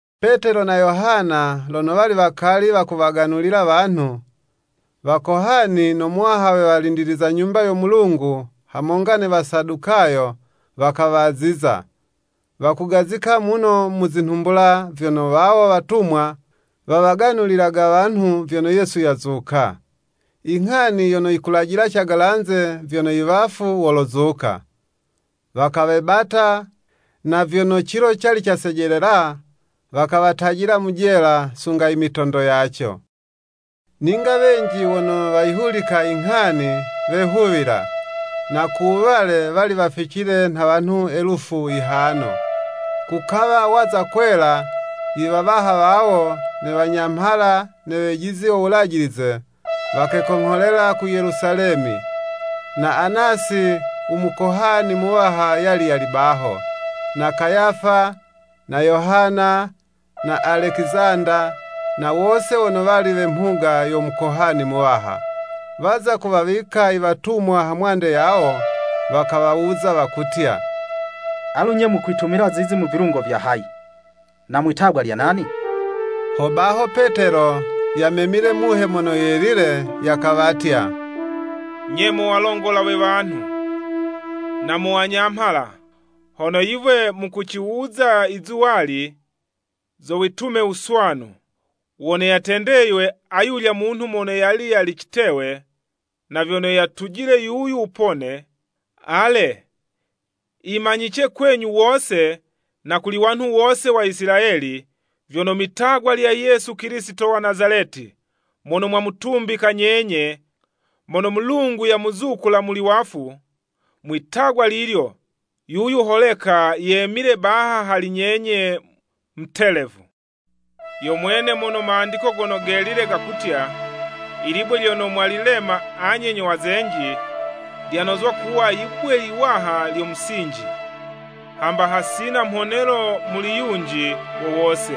Petelo na Yohana lono wali wakali wakuwaganulila wanhu, Wakohani no muwaha we walindiliza Nyumba yo Mulungu hamonga ne Wasadukayo, wakawaziza; wakugazika muno mu zinhumbula, vyono wawo watumwa, wawaganulilaga wanhu vyono Yesu yazuka, inghani yono yikulajila cagalanze vyono iwafu wolozuka. Wakawebata, na vyono cilo cali casejelela, wakawatajila mu jela, sunga imitondo yaco. Ninga wenji wono wayihulika i nghani, wehuwila, na ku wuwale, wali waficile nha wanhu elufu yihano. Kukawa waza kwela, iwawaha wawo ne Wanyamhala ne wejizi wo Wulajilize, wakekongholela ku Yelusalemi, na Anasi u Mukohani Muwaha yali yali baho, na Kayafa, na Yohana, na Alekizanda, na wose wono wali we mhuga yo Mukohani Muwaha. Waza kuwawika iwatumwa hamwande yawo, wakawawuza wakutya, “Alu 'nye, mukwitumila zizi mu vilungo vya hayi, na mwitagwa lya nani?” Hobaho Petelo, yamemile Muhe Mono Yelile, yakawatya, “Nye mo walongola we wanhu, na mo wanyamhala! Hono yiwe mukuciwuza izuwali, zo witume wuswanu wono yatendeywe ayulya munhu mono yali yali citewe, na vyono yatujile yuyu wupone. Ale, yimanyice kwenyu wose, na kuli wanhu wose wa Isilayeli, vyono, mwi'tagwa lya Yesu Kilisito wa Nazaleti, mono mwamutumbika nyenye, mono Mulungu yamuzukula muli wafu, mwi'tagwa lilyo, yuyu holeka yemile baha hali nyenye mutelevu. Yo mwene mono Mandiko Gono Gelile gakutya, ‘Ilibwe lyono mwalilema anye nyo wazenji Lyanozwa kuwa yibwe yiwaha lyo musinji.’ “Hamba hasina mhonelo muli yunji wo wose,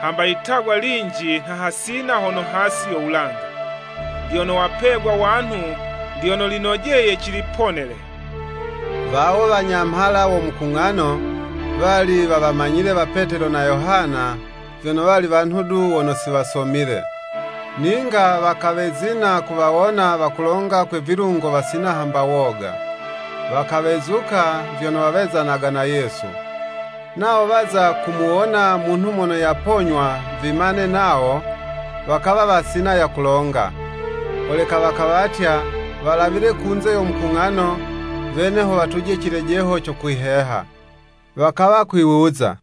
hamba yitagwa linji nha hasina hono hasi yo wulanga, lyono wapegwa wanhu, lyono linojeye ciliponele.” Wawo wanyamhala wo mukung'ano, wali wawamanyile wa Petelo na Yohana vyono wali wanhu du wono si wasomile, ninga wakawezina kuwawona wakulonga kwe vilungo wasina hamba woga. Wakawezuka, vyono wawezanaga na Yesu. Nawo waza kumuwona munhu mono yaponywa vimane nawo, wakawa wasina ya kulonga. Holeka wakawatya walawile kunze yo mukung'ano, wene ho watuje cilejeho co kwiheha. Wakawa kwiwuza,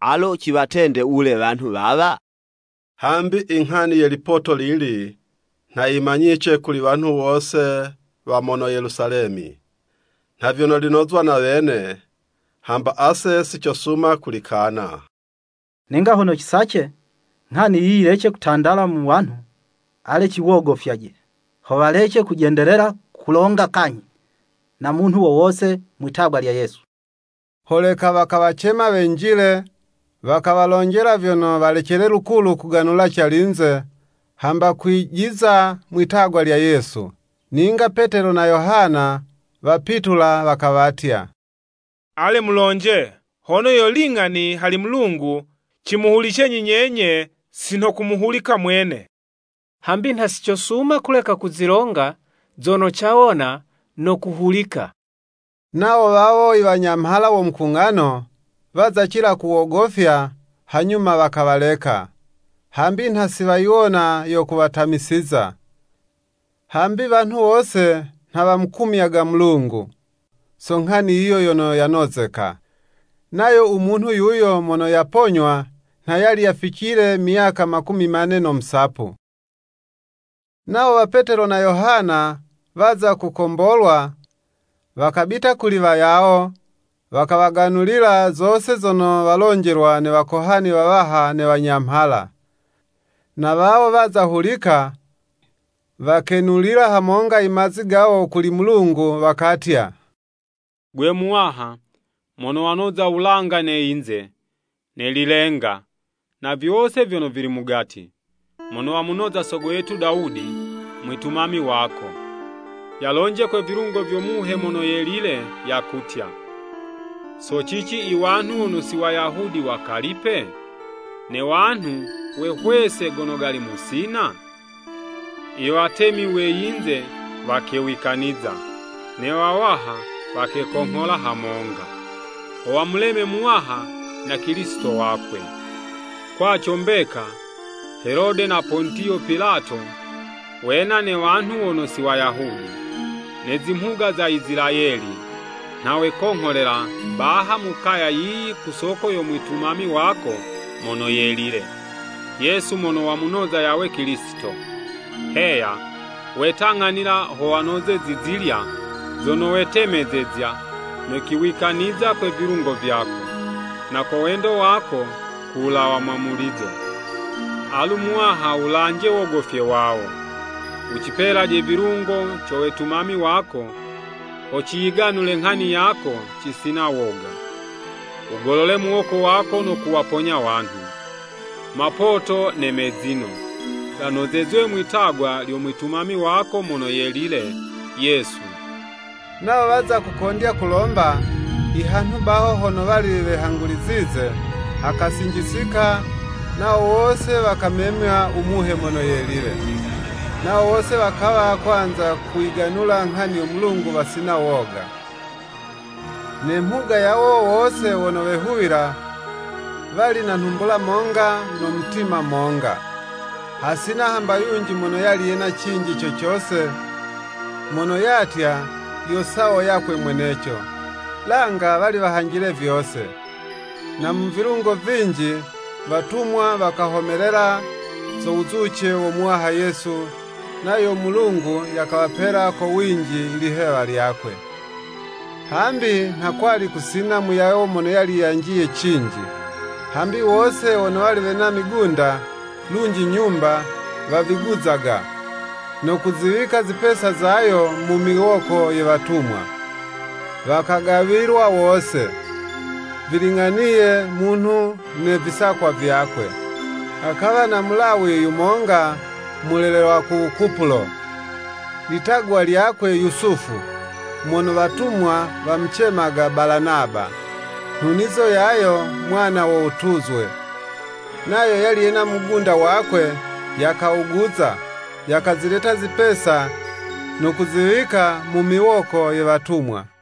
“Alo ciwatende wule wanhu wawa? Hambi i nghani ye lipoto lili nha yimanyice kuli wanhu wose wa mono Yelusalemi, nha vyono linozwa na wene, hamba ase sicosuma kulikana. Ninga hono cisace nghani yiyi yilece kutandala muli wanhu, ale ciwogofyaje, ho walece kujendelela kulonga kanyhi na munhu wo wose mwi'tagwa lya Yesu.” Holeka wakawacema wenjile, wakawalonjela vyono walecele lukulu kuganula calinze, hamba kwijiza mwi'tagwa lya Yesu. Ninga Petelo na Yohana wapitula wakawatya, “Ale mulonje, hono yo ling'ani hali Mulungu cimuhulicenyi nyenye si nho kumuhulika Mwene. Hambi nha si cosuma kuleka kuzilonga zono cawona no kuhulika.” Nawo wawo iwanyamhala wo Mukung'ano waza cila kuwogofya, hanyuma wakawaleka. Hambi nha si wayiwona yo kuwatamisiza, hambi wanhu wose nha wamukumyaga Mulungu, so nghani yiyo yono yanozeka. Nayo u munhu yuyo mono yaponywa nha yali yaficile myaka makumi mane no musapu. Nawo wa Petelo na Yohana waza kukombolwa, wakabita kuli wayawo, wakawaganulila zose zono walonjelwa ne wakohani wawaha ne wanyamhala. Na wawo, waza hulika, wakenulila hamonga i mazi gawo kuli Mulungu, wakatya, “Gwe Muwaha, mono wanoza wulanga ne yinze ne lilenga, na vyose vyono vili mugati! Mono wamunoza sogo yetu Dawudi, mwitumami wako, yalonje kwe vilungo vyo Muhe Mono Yelile, yakutya: ‘So cici i wanhu wono si Wayahudi wakalipe? Ne wanhu wehwesa gono gali musina? Iwatemi we yinze wakewikaniza, Ne wawaha wakekonghola hamonga, Ho wamuleme Muwaha na Kilisito wakwe.’ “Kwaco mbeka, Helode na Pontiyo Pilato, wena ne wanhu wono si Wayahudi, ne zimhuga za Isilayeli, nha wekongholela baha mu kaya yiyi ku soko yo mwitumami wako mono yelile, Yesu mono wamunoza yawe Kilisito. Heya, wetang'anila ho wanoze zizilya, zono wetemezezya no kuziwikaniza kwe vilungo vyako, na ko wendo wako, ku wulawa mwamulizo. Alu Muwaha wulanje wogofye wawo. Wucipelaje vilungo co wetumami wako ho ciyiganule nghani yako cisina woga. Wugolole muwoko wako no kuwaponya wanhu. Mapoto ne mezino, ganozezwe mwi'tagwa lyo Mwitumami wako mono yelile, Yesu.” Nawo waza kukondya kulomba, i hanhu baho hono wali wehangulizize, hakasinjisika, nawo wose wakamemywa u Muhe Mono Yelile. Nawo wose wakawa kwanza kuyiganula nghani yo Mulungu wasina woga. Ne mhuga yawo wose wono wehuwila, wali na nhumbula monga no mutima monga. Hasina hamba yunji mono yali yena cinji co cose, mono yatya, yo sawo yakwe mweneco, langa wali wahanjile vyose. Na mu vilungo vinji, watumwa wakahomelela zo wuzuce wo Muwaha Yesu, nayo u Mulungu yakawapela ko winji lihewa lyakwe. Hambi nha kwali kusina muyawo mono yali yanjiye cinji, hambi wose wono wali wena migunda, lunji nyumba, waviguzaga, no kuziwika zipesa zayo mu miwoko ye watumwa, wakagawilwa wose, viling'aniye munhu ne visakwa vyakwe. Hakawa na mulawi yumonga mulelelwa ku Kupulo, litagwa lyakwe Yusufu, mono watumwa wamucemaga Balanaba, (nhunizo yayo, “Mwana wo wutuzwe.”) Nayo yali yena mugunda wakwe, yakawuguza, yakazileta zipesa, no kuziwika mu miwoko ye watumwa.